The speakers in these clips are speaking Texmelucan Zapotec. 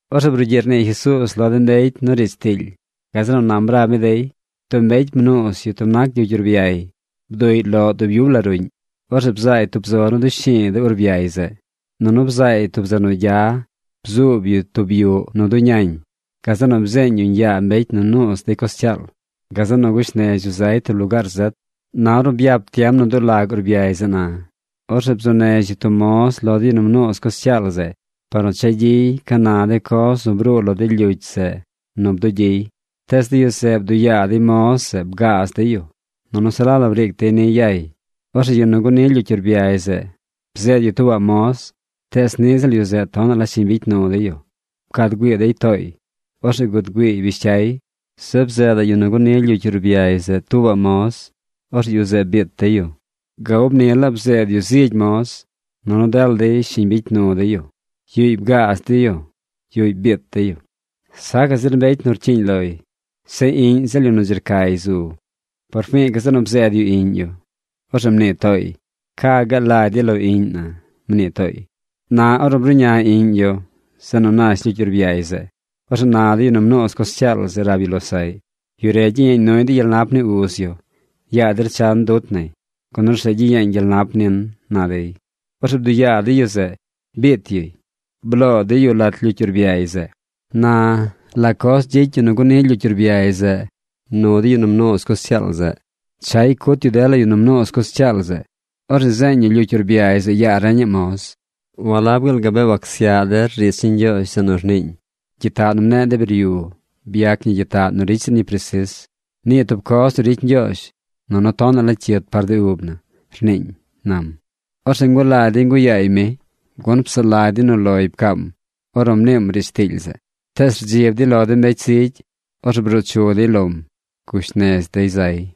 Orzeꞌ brugyiꞌ rnii Jesuuz lo de mbecy nu riidz tiily. Gazeꞌ nu nam rab mi dey: ―Tub mbecy mnuuz yu tub nac lyucy urbyay. Bduꞌy loꞌ dub yub la ruꞌñ. Orzeꞌ bzaay tub zo nu dushi̱i̱ de urbyay zeꞌ. Nunu bzaay tub zeꞌ nu gya bzuub yu tub yuꞌ nu bduñañ. Gazeꞌ nu bzeeñ yuñ yaa mbecy nu nuuz dey coz cyaal. Gazeꞌ nu gush nez yu zay tub lugaar zet. Na ornu byap tiem nu dulag urbyay zeꞌ na, orzeꞌ bzuu nez yu tub moz lo de yu nu mnuuz coz cyaal zeꞌ par nu cha gyiy ca na de coz nu bruu lo de lyucy zeꞌ nu bdugyiy. Tees de yu zeꞌ bduꞌ yaa dey moz zeꞌ bgaaz dey yu, nunu se la la briic dey niy yay. Orzeꞌ yu nu guni lyucy urbyay zeꞌ bzeed yu tuubaꞌ moz, tees niꞌ ziꞌl yu zeꞌ tonaꞌ la shiñ bicy nu dey yu. Pcad güii dey tooy. Orzeꞌ gud güiiy bish cyay. Zeꞌ bzeedaꞌ yu nu guni lyucy urbyay zeꞌ tuubaꞌ moz. Orzeꞌ yu zeꞌ biit dey yu. Ga ub ni laa bzeed yu zigy moz, nunu dela dey shiñ bicy nu dey yu. Yuꞌy bgaaz dey yu. Yuꞌy biit dey yu. ’Sacaꞌ zir mbecy nu rcyiiñ loy. Zeꞌ iꞌñ ziꞌl yu nu dzi rcay zu. Por fi̱i̱ gazeꞌ nu bzeed yu iꞌñ yu. Orzeꞌ mnii tooy: “Ca gaal lagy dey lo iꞌñ na”, mnii tooy. Na ornu bruꞌña iꞌñ yu zeꞌ nu nash lyucy urbyay zeꞌ, orzeꞌ na de yu nu mnuuz coz cyaal zeꞌ rab yu losaꞌy: “Yu re gyiyeeñ nuy de gyel nap ni uz yu. Yaa der chan dut nay, gun orzeꞌ gyiyeeñ gyel nap nin”, na dey. Orzeꞌ bduꞌ yaa dey yu zeꞌ. Biit yuy. Bloo dey yu lat lyucy urbyay zeꞌ. ’Na ¿la coz gyicy yu nu guni lyucy urbyay zeꞌ nu de yu nu mnuuz coz cyaal zeꞌ? Chay cut yu dela yu nu mnuuz coz cyaal zeꞌ. Orzeꞌ zeeñ yu lyucy urbyay zeꞌ yaa reñaꞌ moz. Walab gaal gabee wacsyaꞌ der riidz ni Ñgyoozh zeꞌ nu rniiñ: Gyitaꞌ nu mneꞌ de biryu byac ñi gyitaꞌ nu ricy zir ñi presis. Nii tub coz nu ricy Ñgyoozh nunu tonaꞌ la cyit par de ub na, rniiñ, ―nam. Orzeꞌ ngulagy dey nguꞌ yaay mi, gun psaꞌ lagy dey nu loy pcaam ornu mniim riidz tiily zeꞌ. Tees rdzib dey lo de mbecy zigy. Orzeꞌ bruu chu dey lom. Gush nez dey zay.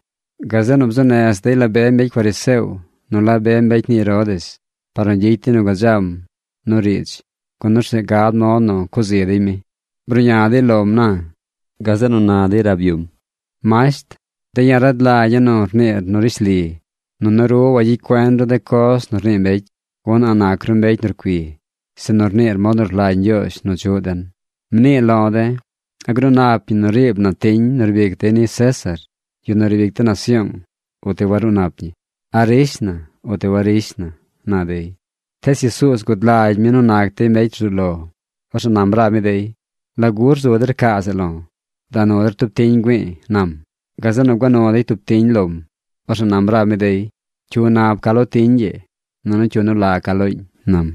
Gazeꞌ nu bzuu nez dey la be mbecy fariseo nu la be mbecy ni Herodes par nu gyicy dey nu gadzam nu riidz gun orzeꞌ gad mod nu cuꞌ zi dey mi. Bruꞌña dey lom na. Gazeꞌ nu na dey rab yum: ―Masht, de̱ ya̱ rad lagya̱ nu rniir nu rishli. Nunu ru wagyicy cuen ru de coz nu rnii mbecy, gun a̱ꞌ nac ru mbecy nu rcui, sinu rniir mod nu rlagy Ñgyoozh nu chuꞌ den. Mnii lo de̱: ¿A gruu nap ñi nu riib na tiñ nu rbic dey ni César, yu nu riib ic de nasyoong, uti waruu nap ñi? ¿A rish na uti warish na? ―na dey. Tees Jesuuz gud lagy mi nu nac dey mbecy rzuu lo. Orzeꞌ nam rab mi dey: ―¿Lagu rzu der caa zeꞌ lo̱? Da nu der tub tiñ güi̱i̱ ―nam. Gazeꞌ nu gua nu dey tub tiñ lom. Orzeꞌ nam rab mi dey: ―¿Cyu nab ca lo tiñ ii nunu cyu nu la ca looñ? ―nam.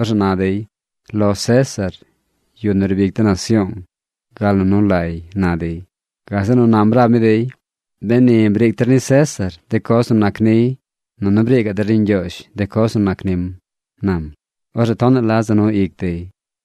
Orzeꞌ na dey: ―Lo César, yu nu riib ic de nasyoong, gal nu nu lay ―na dey. Gazeꞌ nu nam rab mi dey: ―Beni briic der ni César de coz nu nac niy, nunu briic der ni Ñgyoozh de coz nu nac nim ―nam. Orzeꞌ tonaꞌ la za nu ic dey.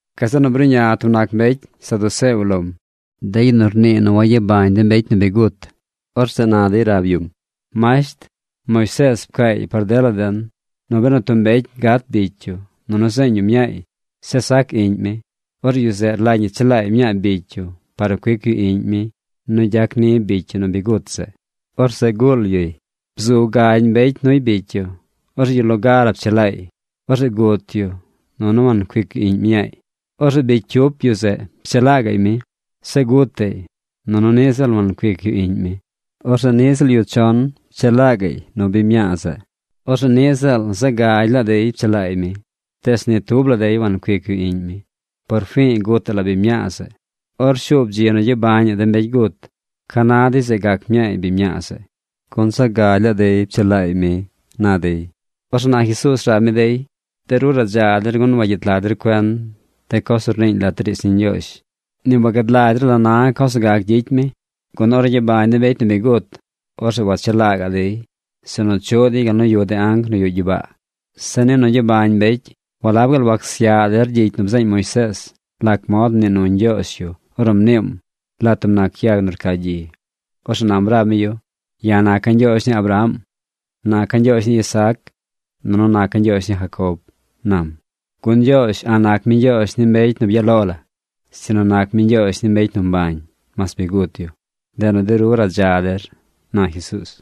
Gazeꞌ nu bruꞌña tub nac mbecy saduceo lom, de yu nu rnii nu wagyabañ de mbecy gut. Orzeꞌ na dey rab yum: ―Masht, Moisees pcaay par dela den nu benu tub mbecy gat bicy yu nunu zeeñ yu mñaay, zeꞌ sac iꞌñ mi, orzeꞌ yu zeꞌ rlagy ñi chelaay mñaa bicy yu par nu cuic yu iꞌñ mi nu gyac ni bicy yu nu bi gut zeꞌ. Orzeꞌ guul yuy. Bzu gagy mbecy nuy bicy yu. Orzeꞌ yu loga la pchelaay. Orzeꞌ gut yu nunu wancuic yu iꞌñ mñaay. Orzeꞌ bicy cyup yu zeꞌ pchelaa gaꞌy mi. Zeꞌ gutaꞌy nunu niꞌ ziꞌl wancuic yu iꞌñ mi. Orzeꞌ niꞌ ziꞌl yu chon pchelaa gaꞌy nu biñ mñaa zeꞌ. Orzeꞌ niꞌ ziꞌl zaꞌ gagy laa dey pchelaay mi. Tees ni tub la dey wancuic yu iꞌñ mi. Por fi̱i̱ gutaꞌ la biñ mñaa zeꞌ. Or shuub dzi nu gyabañaꞌ de mbecy gut, ¿ca na dey zeꞌ gac mñaay biñ mñaa zeꞌ, gun zaꞌ gagy laa dey pchelaay mi? ―na dey. Orzeꞌ na Jesuuz rab mi dey: ―De ru radza der gun wagyet lag der cuen de coz nu rniiñ lat riidz ni Ñgyoozh. Ni wagad lagy der la na coz nu gac gyicy mi. Gun ornu gyabañ de mbecy nu bi gut, orzeꞌ wachelaa gaꞌ dey, sinu chuꞌ dey gal nu yuꞌ de anc nu yuꞌ gyibaa. Zeꞌ ni nu gyabañ mbecy, ¿walab gaal wacsyaꞌ der gyicy nu bzeeñ Moisees lac mod mnii nu Ñgyoozh yu ornu mniim lat tub yag nu rca gyi? Orzeꞌ nam rab mi yu: “Ya̱ naca̱ Ñgyoozh ni Abraham, naca̱ Ñgyoozh ni Isaac, nunu naca̱ Ñgyoozh ni Jacob”, nam. ¡Gun Ñgyoozh a̱ꞌ nac mi Ñgyoozh ni mbecy nu byaꞌ lo la, sinu nac mi Ñgyoozh ni mbecy nu mbañ, mas bi gut yu! Ndeꞌ nu de ru radza der ―na Jesuuz.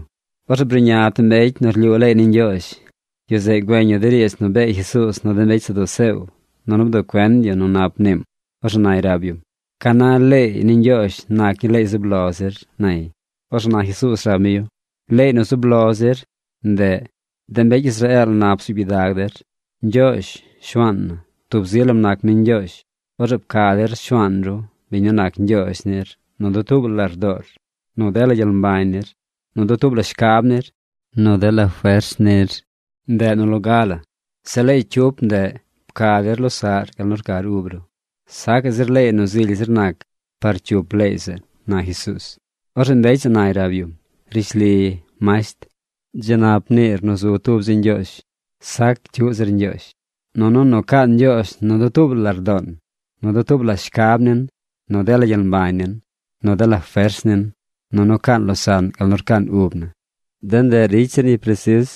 Orzeꞌ bruꞌña tub mbecy nu rlyuu leey ni Ñgyoozh. Yu zeꞌ güeñ yu de riidz nu bee Jesuuz nu de mbecy saduceo nunu bduꞌ cuen yu nu nap mniim. Orzeꞌ nay rab yum: ―¿Ca na leey ni Ñgyoozh nac ñii leey zub lo zir? ―nay. Orzeꞌ na Jesuuz rab mi yu: ―Leey nu zub lo zir, ndeꞌ: “De mbecy Israeel nap bzuub gyidag der. Ñgyoozh, Shuaan na, tub zi lam nac mi Ñgyoozh. Orzeꞌ pca der Shuaan ru, biñ nu nac Ñgyoozh nir nu dutuub la lardoor, nu dela gyel mbañ nir, nu dutuub la shcab nir, nu dela fers nir.” Ndeꞌ nu loga la. Zeꞌ leey cyup ndeꞌ: “Pca der losaꞌr gal nu rcar ub ru.” Sacaꞌ zir leey nu zily zir nac par cyup leey zeꞌ ―na Jesuuz. Orzeꞌ mbecy zeꞌ nay rab yum: ―Rishli, masht, dzi nap mniir nu zu tub zi Ñgyoozh. Sac cyuꞌ zir Ñgyoozh. Nunu nu caan Ñgyoozh nu dutuub la lardoon, nu dutuub la shcab nin, nu dela gyel mbañ nin, nu dela fers nin, nunu caan losaꞌn gal nu rcaan ub na. De ndeꞌ ricy zir ñi presis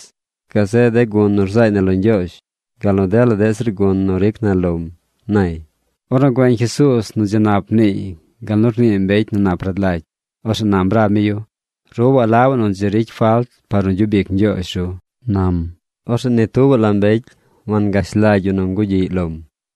gazeꞌ de gun nu rzaay na lo Ñgyoozh gal nu dela deꞌ zir gun nu ricy na lom ―nay. Ornu güeñ Jesuuz nu dzi nap mniiy gal nu rnii mbecy nu nap rad lagy, orzeꞌ nam rab mi yu: ―Ru walabaꞌ nu dzi ricy falt par nu gyub ic Ñgyoozh ru ―nam. Orzeꞌ ni tubaꞌ la mbecy wangash lagy yu nu ngugyiꞌy lom.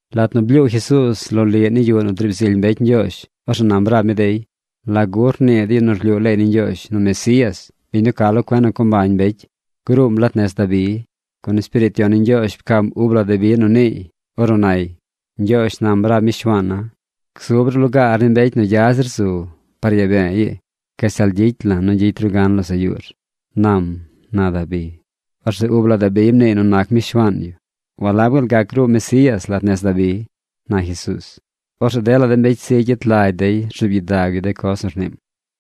Lat nu blyuu Jesuuz loliꞌ ni yuꞌ nu driib zily mbecy Ñgyoozh, orzeꞌ nam rab mi dey: ―¿Lagu rnii de yu nu rlyuu leey ni Ñgyoozh nu Mesías, biñ nu ca lo cuen nu co mbañ mbecy, gruum lat nez Dabi? Gun Espiriit Yon ni Ñgyoozh pcaam uub la Dabi nu niiy ornu nay: Ñgyoozh nam rab mi Shuaan na: “Gzub ru lugaar ni mbecy nu gya zir zu, par yaa be̱e̱ ii gashtal gyicy la̱ nu gyicy ru gan losaꞌ yuur”, nam, na Dabi. Orzeꞌ ub la Dabi mniiy nu nac mi Shuaan yu. ¿Walab gaal gac gruu Mesías lat nez Dabi? ―na Jesuuz. Orzeꞌ dela de mbecy zigy yet lagy dey rzuub gyidag yu coz nu rniim.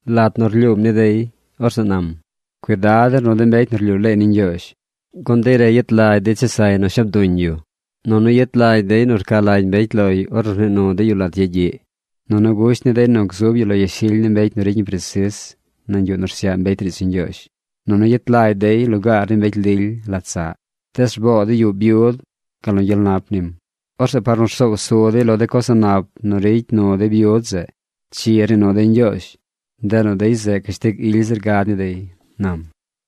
Lat nu rlyuum ni dey, orzeꞌ nam: ―Cuidad der nu de mbecy nu rlyuu leey ni Ñgyoozh. Gun dey re yet lagy dey chesay nu shab duñ yu, nunu yet lagy dey nu rca lagy mbecy loy ornu rnii nu dey yu lat yagyiꞌ. Nunu gusht ni dey nu gzub yu lo yashily ni mbecy nu ricy ñi presis nañ yuꞌ nu rsyaꞌ mbecy riidz ni Ñgyoozh, nunu yet lagy dey lugaar ni mbecy lily lat saꞌ. Tees rboo dey yuꞌ byud gal nu gyel nap nim. Orzeꞌ par nu rsoow su dey lo de coz a̱ꞌ nap nu ricy nu dey byud zeꞌ, chi rnii nu dey Ñgyoozh. Ndeꞌ nu dey zeꞌ cashtig ily zir gad ni dey ―nam.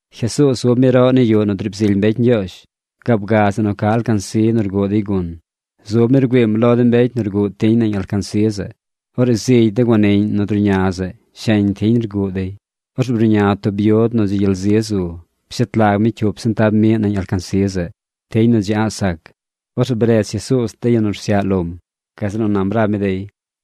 Jesuuz zub mi roꞌ ni yuꞌ nu driib zily mbecy Ñgyoozh, gaab zeꞌ nu ca alcansi nu rguꞌ dey gun. Zub mi rgüiim lo de mbecy nu rguꞌ tiñ nañ alcansi zeꞌ. Orzeꞌ zigy de guaniꞌñ nu druꞌña zeꞌ sheñ tiñ rguꞌ dey. Orzeꞌ bruꞌña tub byud nu dzi gyel zi zu. Pshet lag mi cyup sentab miꞌ nañ alcansi zeꞌ, tiñ nu dzi a̱ꞌ sac. Orzeꞌ bredz Jesuuz de yu nu rsyaꞌ lom. Gazeꞌ nu nam rab mi dey: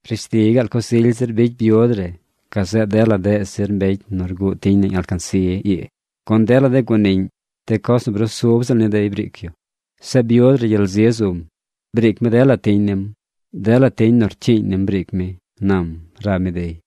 ―Rishli gaal coz ily zir bicy byud re gazeꞌ dela deꞌ zir mbecy nu rguꞌ tiñ nañ alcansi ii. Gun dela de guaniꞌñ, de coz nu brusub ziꞌl ni dey briic yu. Zeꞌ byud re gyel zi zum. Briic mi dela tiñ nim. Dela tiñ nu rcyiiñ nim briic mi ―nam rab mi dey.